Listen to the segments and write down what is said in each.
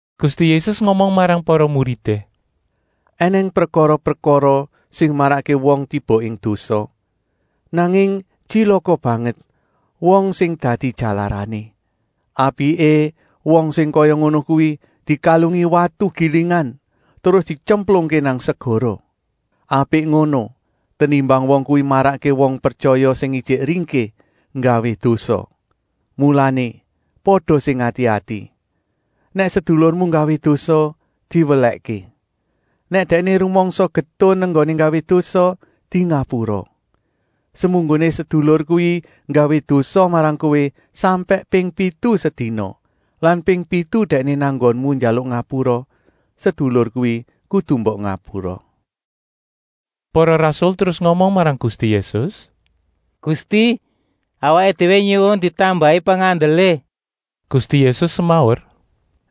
Gusti Yésus ngomong marang para muridé: “Enèng prekara-prekara sing marakké wong tiba ing dosa, nanging tyilaka banget wong sing dadi jalarané. Apiké wong sing kaya ngono kuwi dikalungi watu gilingan, terus dityemplungké nang segara. Apik ngono tenimbang wong kuwi marakké wong pretyaya sing ijik ringkih nggawé dosa. Mulané pada sing ati-ati! “Nèk sedulurmu nggawé dosa, diwelèhké. Nèk dèkné rumangsa getun enggoné nggawé dosa, dingapura. Semunggoné sedulur kuwi nggawé dosa marang kowé sampèk ping pitu sedina lan ping pitu dèkné nang nggonmu njaluk ngapura, sedulur kuwi kudu mbok ngapura.” Para rasul terus ngomong marang Gusti Yésus: “Gusti, awaké déwé nyuwun ditambahi pengandelé.” Gusti Yésus semaur: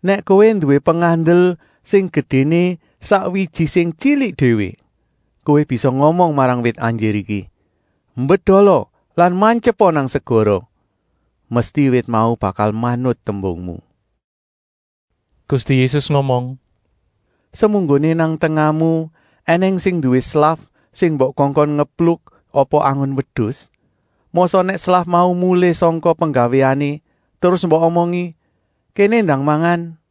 “Nèk kowé nduwé pengandel sing gedéné sak wiji sing tyilik déwé, kowé bisa ngomong marang wit anjir iki: ‘Mbedola lan mantyepa nang segara,’ mesti wit mau bakal manut tembungmu.” Gusti Yésus ngomong: “Semunggoné nang tengahmu ènèng sing nduwé slaf sing mbok kongkon ngepluk apa angon wedus, mosok nèk slaf mau mulih sangka penggawéané terus mbok omongi: ‘Kéné ndang mangan!’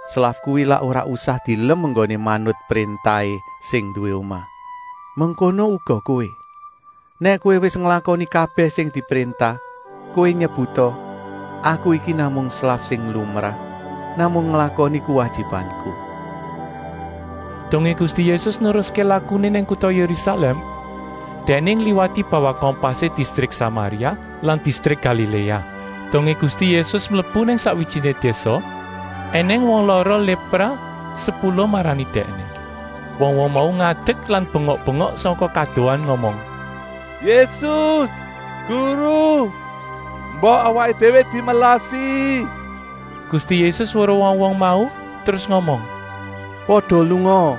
Slaf kuwi lak ora usah dielem enggoné manut préntahé sing nduwé omah? Mengkono uga kowé. Nèk kowé wis nglakoni kabèh sing dipréntah, kowé nyebuta: ‘Aku iki namung slaf sing lumrah, namung nglakoni kuwajibanku.’” Dongé Gusti Yésus neruské lakuné nang kuta Yérusalèm, Dèkné ngliwati bawah kompasé distrik Samaria lan distrik Galiléa. Dongé Gusti Yésus mlebu nang sakwijiné désa ènèng wong lara lépra sepuluh marani Dèkné. Wong-wong mau ngadek lan bengok-bengok sangka kadohan ngomong: “Yésus, Guru, mbok awaké déwé dimelasi!” Gusti Yésus weruh wong-wong mau terus ngomong: “Pada lungaa,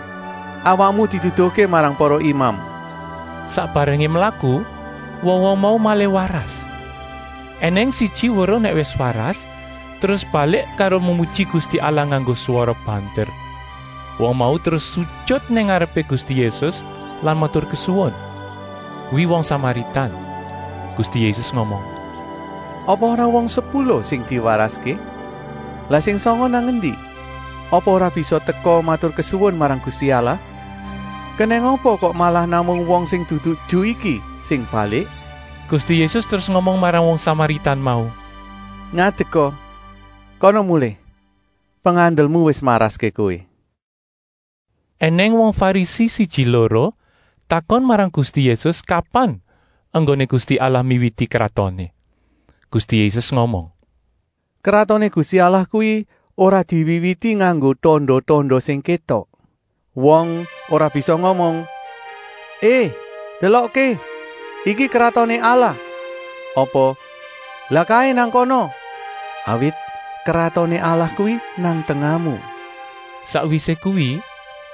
awakmu diduduhké marang para imam.” Sak barengé mlaku wong-wong mau malih waras. Enèng siji weruh nèk wis waras, terus balik karo memuji Gusti Allah nganggo swara banter. Wong mau terus sujut nang ngarepé Gusti Yésus lan maturkesuwun. Kuwi wong Samaritan. Gusti Yésus ngomong: “Apa ora wong sepuluh sing diwaraské? Lah sing sanga nang endi? Apa ora bisa teka maturkesuwun marang Gusti Allah? Kenèng apa kok malah namung wong sing dudu Ju iki sing balik?” Gusti Yésus terus ngomong marang wong Samaritan mau: “Ngadeka, kana mulih, pengandelmu wis maraské kowé!” Enèng wong Farisi siji-loro takon marang Gusti Yésus kapan enggoné Gusti Allah miwiti Kratoné. Gusti Yésus ngomong: “Kratoné Gusti Allah kuwi ora diwiwiti nganggo tanda-tanda sing kétok. Wong ora bisa ngomong: ‘Hé, delokké, iki Kratoné Allah!’ Apa: ‘Lah kaé nang kana!’ Awit Kratoné Allah kuwi nang tengahmu.” Sakwisé kuwi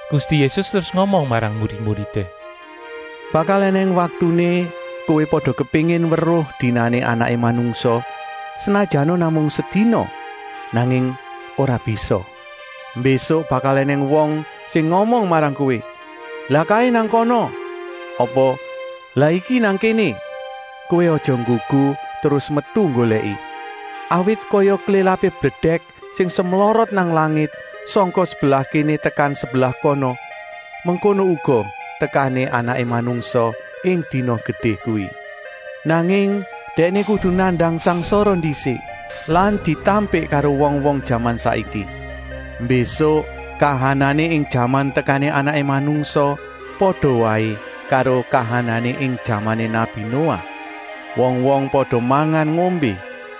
Gusti Yésus terus ngomong marang murid-muridé: “Bakal ènèng waktuné kowé pada kepéngin weruh dinané Anaké Manungsa, senajana namung sedina, nanging ora bisa. Mbésuk bakal ènèng wong sing ngomong marang kowé: ‘Lah kaé nang kana,’ apa, ‘Lah iki nang kéné!’ Kowé aja nggugu terus metu nggolèki. Awit kaya klélapé bledèk sing semlorot nang langit sangka sebelah kéné tekan sebelah kana, mengkono uga tekané Anaké Manungsa ing dina gedé kuwi. Nanging Dèkné kudu nandang sangsara ndisik lan ditampik karo wong-wong jaman saiki. Mbésuk kahanané ing jaman tekané Anaké Manungsa pada waé karo kahanané ing jamané nabi Noah. Wong-wong pada mangan-ngombé,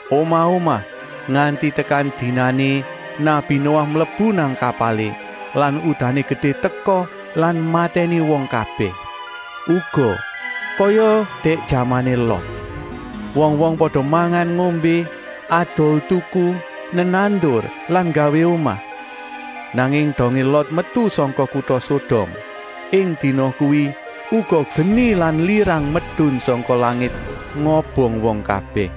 omah-omah, nganti tekan dinané nabi Noah mlebu nang kapalé lan udané gedé teka lan matèni wong kabèh. Uga kaya dèk jamané Lot. Wong-wong pada mangan-ngombé, adol-tuku, nenandur lan nggawé omah. Nanging dongé Lot metu sangka kuta Sodom, ing dina kuwi uga geni lan lirang medun sangka langit ngobong wong kabèh.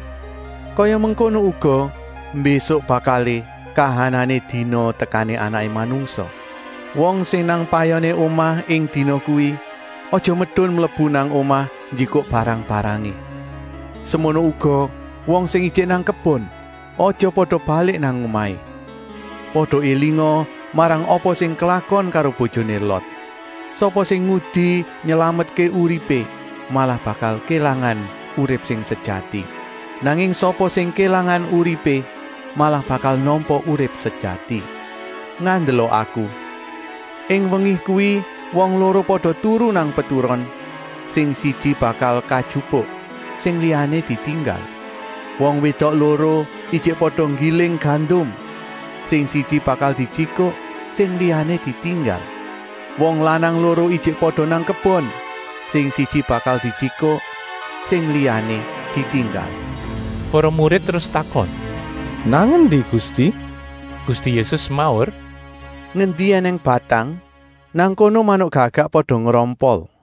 Kaya mengkono uga mbésuk bakalé kahanané dina tekané Anaké Manungsa. “Wong sing nang payoné omah ing dina kuwi aja medun mlebu nang omah njikuk barang-barangé. Semono uga wong sing ijik nang kebon, aja pada balik nang omahé. Pada élinga marang apa sing klakon karo bojoné Lot. Sapa sing ngudi nylametké uripé malah bakal kélangan urip sing sejati. Nanging sapa sing kélangan uripé malah bakal nampa urip sejati. Ngandela Aku, ing wengi kuwi wong loro pada turu nang peturon, sing siji bakal kajupuk, sing liyané ditinggal. Wong wédok loro ijik pada nggiling gandum, sing siji bakal dijikuk, sing liyané ditinggal. ( Wong lanang loro ijik pada nang kebon, sing siji bakal dijikuk, sing liyané ditinggal.)” Para murid terus takon: “Nang endi Gusti?” Gusti Yésus semaur: “Ngendi ènèng batang, nang kono manuk gagak pada ngrompol.”